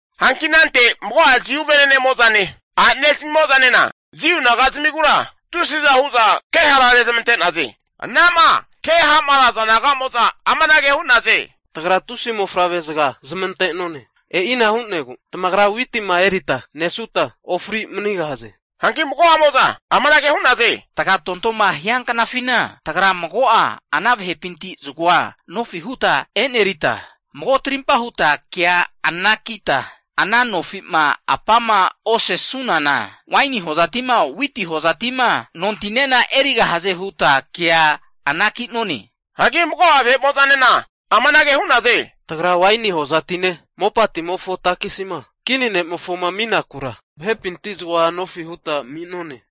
Hanki anante mago'a Jiu venenemo'zane a'nene zamimo'zanena Jiu naga'zamigura tusiza hu'za ke hara rezmante'naze. Anama keha'maraza naga'moza amanage hu'naze, Tagra tusi mofavrezaga zamante'none. E'ina hu'negu tagrama witima erita nesuta ofri manigahaze. Hanki mago'amo'za amanage hu'naze, tagatontoma hia knafina tagra mago'a ana vahepinti zagoa nofi huta enerita, mago tarimpa huta kea anakita ana nofi'ma apa'ma osesunana, waini hozati'ma witi hozati'ma nontinena erigahaze huta kea anaki'none. Hagi mago'a vahe'mo'zanena amanage hu'naze, Tagra waini hozatine, mopatimofo takisima kini ne'mofoma aminakura vahepinti zagoa nofi huta ami'none.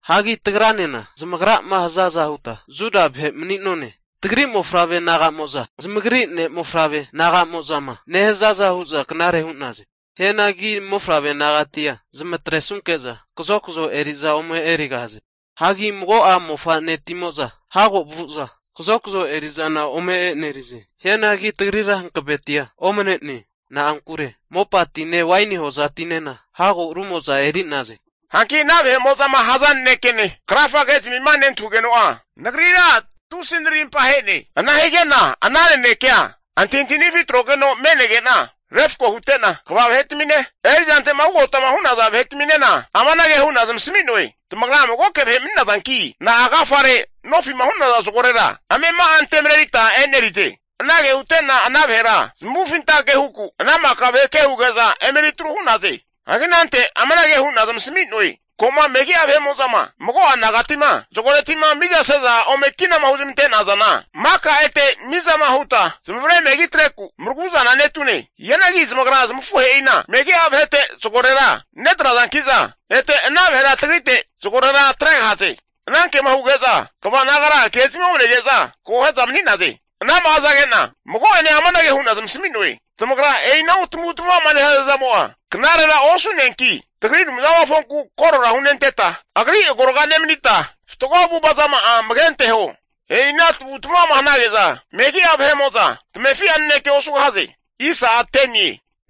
Hagi tagranena zamagrama hazaza huta Juda vahe mani'none. Tagri mofavre naga'mo'za zamagri ne'mofavre naga'mo'zama nehazaza hu'za knare hu'naze. Hianagi mofavre nagatia zamatresanunke'za kazokazo eri'za ome erigahaze. Hagi mago'a mofa'netimo'za hago vu'za kazokazo eri'zana ome enerize. Hianagi tagrira hankavetia omane'ne, na'ankure mopatine waini hozatinena hago rumo'za eri'naze. Hanki ana vahe'mo'zama haza nanekene krafa ke'zamima nentahugeno'a nagrira tusi narimpa ahe'ne. Ana hige'na ana nanekea antahintahinifi atrogeno me'nege'na refko hute'na, kva vahe'tamine erizante'ma ugotama hu'naza vahetaminena amanage hu'na zamasami'noe, tamagra magoke vahe mani'nazanki na'agafare nofi'ma hu'naza zagorera amema'a ante marerita enerize. Anage hute'na ana vahera zamuvufintanke huku, ana maka vahe kuhuge'za eme eri tru hu'naze. Hagi anante amanage hu'na zamasami'noe, Ko'ma megi'a vahe'mo'zama mago'a nagatima zagoreti'ma mizase'za ome kinama huzmante'nazana maka ete mizama huta zamavare megi atreku maraguzana netune. Hianagi zamagra zamafuhe'ina megi'a vahete zagorera netrazanki'za ete ana vahera tagrite zagore atregahaze. Anankema huge'za kva nagara ke'zamia omanege'za akohe'za mani'naze. Anama hazage'na mago'ene amanage hu'na zamasami'noe, Tamagra e'inahu tamavutamava'ma nehaza zamo'a knarera osu'neanki, tagri Anumzamofonku korora hunenteta, Agri agorga nemanita fatgo avu'avazama'a amage anteho. E'ina tamavu'tamavama hanage'za megi'a tamefi'a nanekea osugahaze.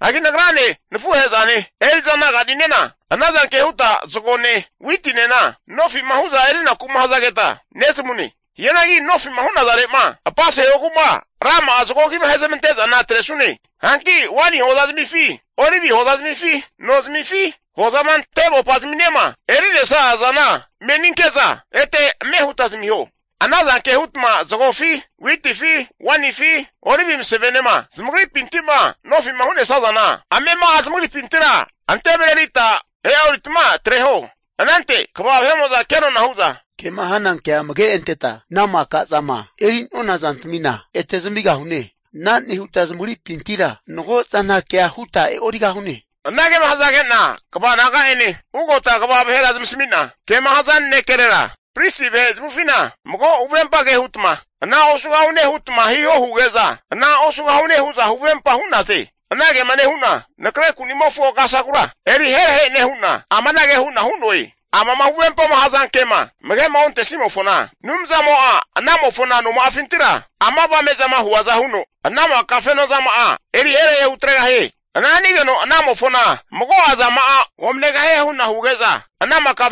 Hagi nagrane nafuhe'zane eri'za naga'ninena ana zanke huta zagone witinena nofi'ma hu'za erinaku'ma hazageta nezamune. Hianagi nofi'ma hu'nazare'ma apasehogu'ma rama'a zago agima ahezmante'zana atresune. Hanki waini hoza zamifi, olivi hoza zamifi, no zamifi hozama ante mopa'zaminema eri'nesazana meninke'za ete ame huta zamiho. Ana zanke hutma zagofi, witifi, wainifi olivi masavenema zamagripinti'ma nofi'ma hu'nesazana amema'a zamagripintira ante marerita e'oritma atreho. Anante kva vahe'mo'za kenona hu'za, Kema hana kea amage anteta ana maka zama eri'nona zantamina ete zamigahune. Ana nehuta zamagripintira mago zana kea huta e'origahune. Anagema hazage'na kva naga'ene ugota kva vahera zamasami'na, kema haza nanekerera pristi vahe zamavufina mago huvempa ke hutma ana osugahune hutma hiho huge'za ana osugahune hu'za huvempa hu'naze. Anagema nehu'na nakre kuni'mofo kasagura eriherahe nehu'na, amanage hu'na hu'noe, Amama huvempama hazankema, amage'ma ontesimofona Anumzamo'a anamofo noma'afintira ama avame'zama huaza huno, ana maka vahe'mo'za fenozama'a eri herahe hutregahie. Ana hanigeno anamofona mago'a zama'a omanegahie hu'na huge'za, ana maka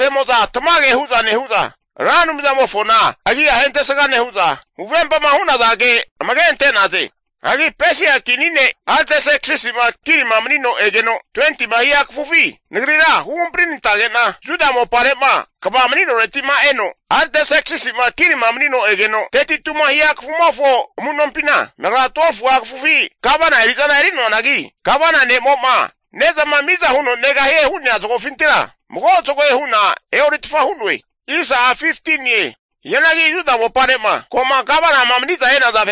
tamage hu'za nehu'za Ra Anumzamofona agi'a ahentesga nehu'za, huvempama hu'naza ke amage ante'naze. Hagi Pesia kini ne' Artserksisi'ma kinima manino egeno 20ma hia kafufi, nagrira huhampari nantage'na Juda mopare'ma kva mani'noreti'ma eno, Artserksisi'ma kini manino egeno 32ma hia kafumofo amu'nompina nagra 12fu'a kafufi gavana eri'zana eri'noanagi, gavana ne'mo'ma ne'zama miza huno negahie hu'nea zagofintira mago zagoe hu'na e'oritfa hu'noe. Hianagi Juda mopare'ma ko'ma gavana mani'za e'naza,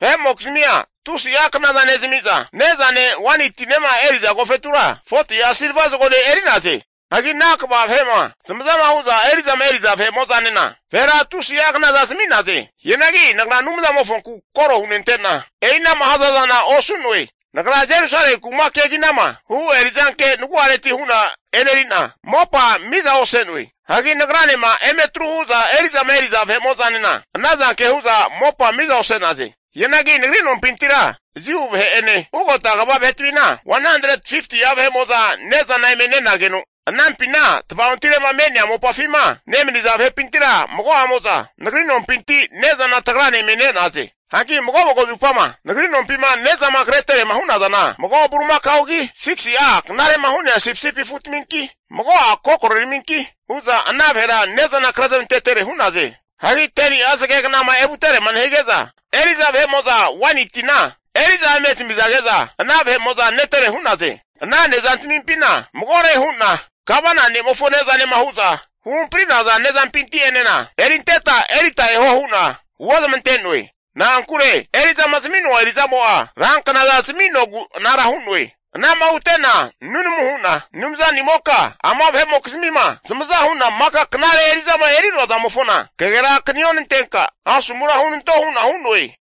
vahe'mokizmia tusi'a kna nezami'za, ne'zane waini tinema eriza agofetura, 40'a silva zagone eri'naze. Hagi ana kva vahe'ma zamaza hu'za eri'zama eri'za vahe'mo'zanena, vahera tusi'a knaza zami'naze. Hianagi nagra Anumzamofonku koro hunente'na e'inama hazazana osu'noe. Nagra Jerusalemi kuma keginama hu' eri'zanke nagu'areti hu'na e'neri'na mopa miza ose'noe. Hagi nagranema eme atru hu'za eri'zama eri'za vahe'mo'zanena, ana zanke hu'za mopa miza ose'naze. Hianagi nagri nompintira Jiu vahe'ene ugota kva vahetamina 150'a vahe'mo'za ne'zana eme nenageno, anampina tvaontire'ma me'nea mopafima nemaniza vahepintira mago'amo'za nagri nompinti tagrane ne'zana eme ne'naze. Hanki mago mago zupama nagri nompima ne'zama kre terema hu'nazana vahe'mo'za mago bulimakaogi, 6si'a knare'ma hu'nea sipisipi afutaminki, mago'a kokore raminki hu'za ana vahera ne'zana krezamantetere hu'naze. Hagi 10ni'a zage kna'ma evuterema nehige'za, eri'za waini tina eri'za eme zamizage'za, ana netere hu'naze. Ana ne'zantamimpina, magore hu'na gavana ne'mofo ne'zanema hu'za huhampari'naza ne'zampinti'enena erinteta erita eho hu'na huozamante'noe. Na'ankure eri'zama zami'noa eri'zamo'a ranknaza zaminogu anara hu'noe. Anama hute'na nunamu hu'na, Anumzanimoka ama vahe'mokizmima zamaza hu'na maka knare eri'zama eri'noazamofona kagera akanionantenka asomura hunanto hu'na hu'noe.